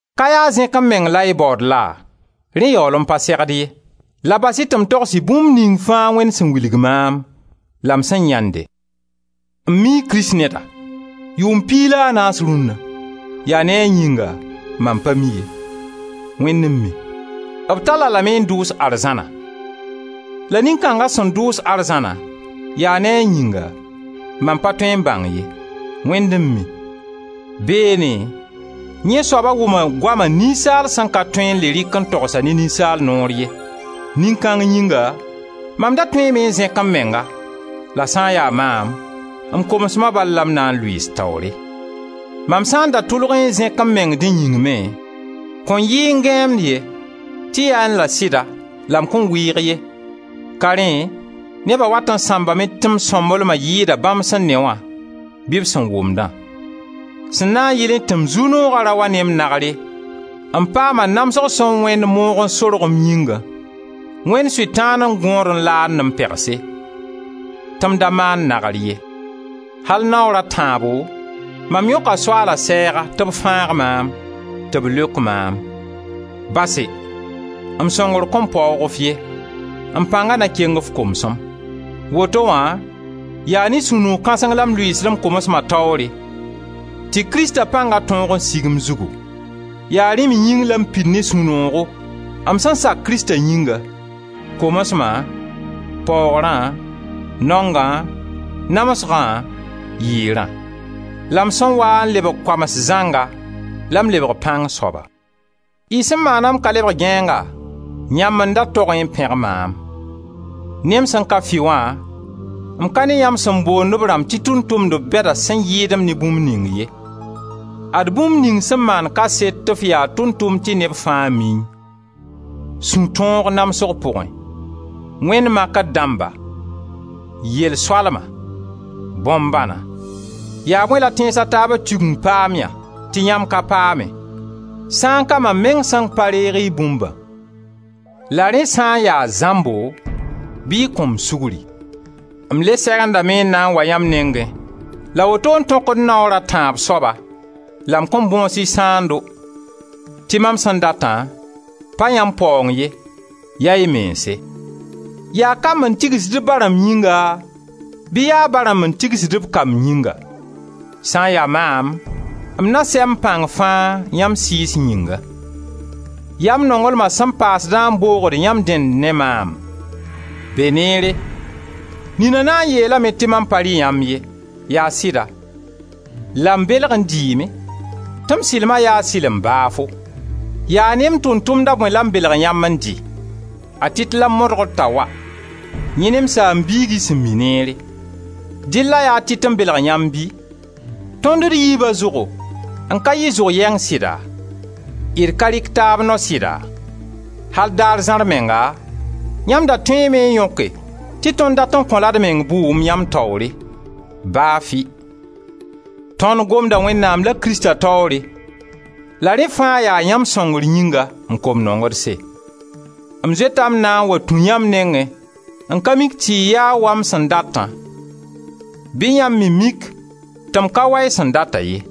Ka yaa zẽk-m-meng la y baood laa? (Rẽ yaool n pa segd ye) la bas-y tɩ m togs-y bũmb ning fãa Wẽnd sẽn wilg maam la m sẽn yãende. M mii kristneda, yʋʋm piig la a naas rũnna (yaa ne a yĩnga, mam pa mi ye, Wẽnd n mi) b tall-a lame n dʋʋs arzãna. La nin-kãnga sẽn dʋʋs arzãna, yaa ne a yĩnga, mam pa tõe n bãng ye, Wẽnd n mi. Beene, yẽ soaba wʋma goama ninsaal sẽn ka tõe n le rɩk n togs ne ninsaal noor ye. Nin-kãng yĩnga, mam da tõeeme n zẽk m menga, la sã n ya maam, m komsma bal la m na n lʋɩɩs taoore. Mam sã n da tʋlgẽ n zẽk m meng dẽ yĩng me, kõn yɩẽ gãeemd ye, tɩ yaẽ la sɩda, la m kõn wɩɩg ye, ka rẽ neba wat n sãmbame tɩ m sõmblema yɩɩda bãmb sẽn ne wã, bɩ b sẽn wʋmdã. Sẽn na n yɩlẽ tɩ m zu-nooga ra wa ne m nagre, m paama namsg sẽn wẽnd moog n sorg m yĩngã, wẽnd Sʋtãan n gõod n laand-m pegse — tɩ m da maan nagr ye! Al naoor a tãabo mam yõka Soaala sɛɛga tɩ b fãag maam, tɩ b leok maam: «Base, m sõngr kõn paoog f ye, m pãnga na keng f komsem.» Woto wã yaa ne sũ-noog kãseng la m lʋɩɩsd m komsma taoore tɩ Krista pãnga tõog n sig m zugu. Yaa rẽ me yĩng la m pid ne sũ-noogo m sẽn sak Krista yĩnga, komsma, paoogrã, naongã, namsgã, yɩɩrã. La m sẽn waa n lebg koams zãnga la m lebg pãng soaba. Y sẽn maana m ka lebg gãeenga! Yãmb n da togẽ n pẽg maam. Ne m sẽn ka fɩ wã, m ka ne yãmb sẽn boond b rãmb tɩ tʋʋm-tʋmdb bɛda sẽn yɩɩd-m ne bũmb ning ye. Ad bũmb ning sẽn maand kaset tɩ f yaa tʋʋm-tʋmd tɩ neb fãa miẽ: sũ-tõog namsg pʋgẽ, wẽnd makr dãmba, yel-soalma, bõn-bãna. Yaa bõe la tẽns a taaba Tigeng paamyã tɩ yãmb ka paame sã n ka mam meng sẽn pa reeg y bũmbã? La rẽ sã n ya zãmbo bɩ y kõ-m sugri. M le segendame n na n wa yãmb nengẽ la woto n tõkd m naoor a tãab soaba la m kõn bõs y sãando, tɩ mam sẽn data, pa yãmb paoong ye, ya y mense. Yaa kamb n tigsd b ba rãmb yĩnga, bɩ yaa ba rãmb n tigsd b kamb yĩnga? Sã n ya maam, m na n sɛ m pãng fãa yãmb sɩɩs yĩnga; yaa m nonglma sẽn paasdã n boogd yãmb dẽnd ne maam? Beneere, nina na n yeelame tɩ mam pa rɩ yãmb ye, yaa sɩda, la m belg n dɩɩme tɩ m sɩlma yaa sɩlem baafo. Yaa ne m tʋʋm-tʋmda bõe la m belg yãmb n dɩ? A Tit la m modgr t'a wa, yẽ ne m saam-biig y sẽn mi neere. Dɩlla yaa Tit n belg yãmb bɩ? Tõnd d yiiba zʋgo n ka yɩ zʋg yɛng sɩda? D ka rɩk taab nao sɩda? Al daar zãar menga yãmb da tõeeme n yõke tɩ tõnd dat n kõ-la d meng bʋʋm, yãmb taoore, baa fɩ! Tõnd gomda Wẽnnaam la Krista taoore la rẽ fãa yaa yãmb sõngr yĩnga, m kom nongedse. M zoeta m na n wa tũ yãmb nengẽ n ka mik tɩ y yaa wa m sẽn datã, bɩ yãmb me mik tɩ m ka ya wa y sẽn data ye.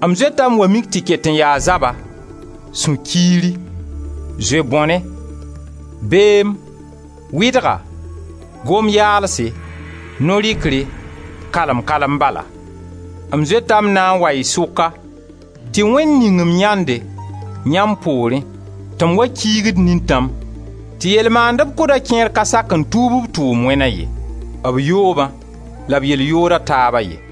M zoeta m wa mik tɩ ket n yaa zaba, sũ-kiiri, zoe-bõne, beem, wɩdga, gom yaalse, no-rɩkre, kalem-kalem bala. M zoeta m na n wa y sʋka, tɩ Wẽnd ning-m yãnde, yãmb poorẽ, tɩ m wa kiigd nintãm, tɩ yell maandeb kʋdã kẽer ka sak n tuub b tʋʋm wẽna ye: b yoobã la b yell yooda taaba ye.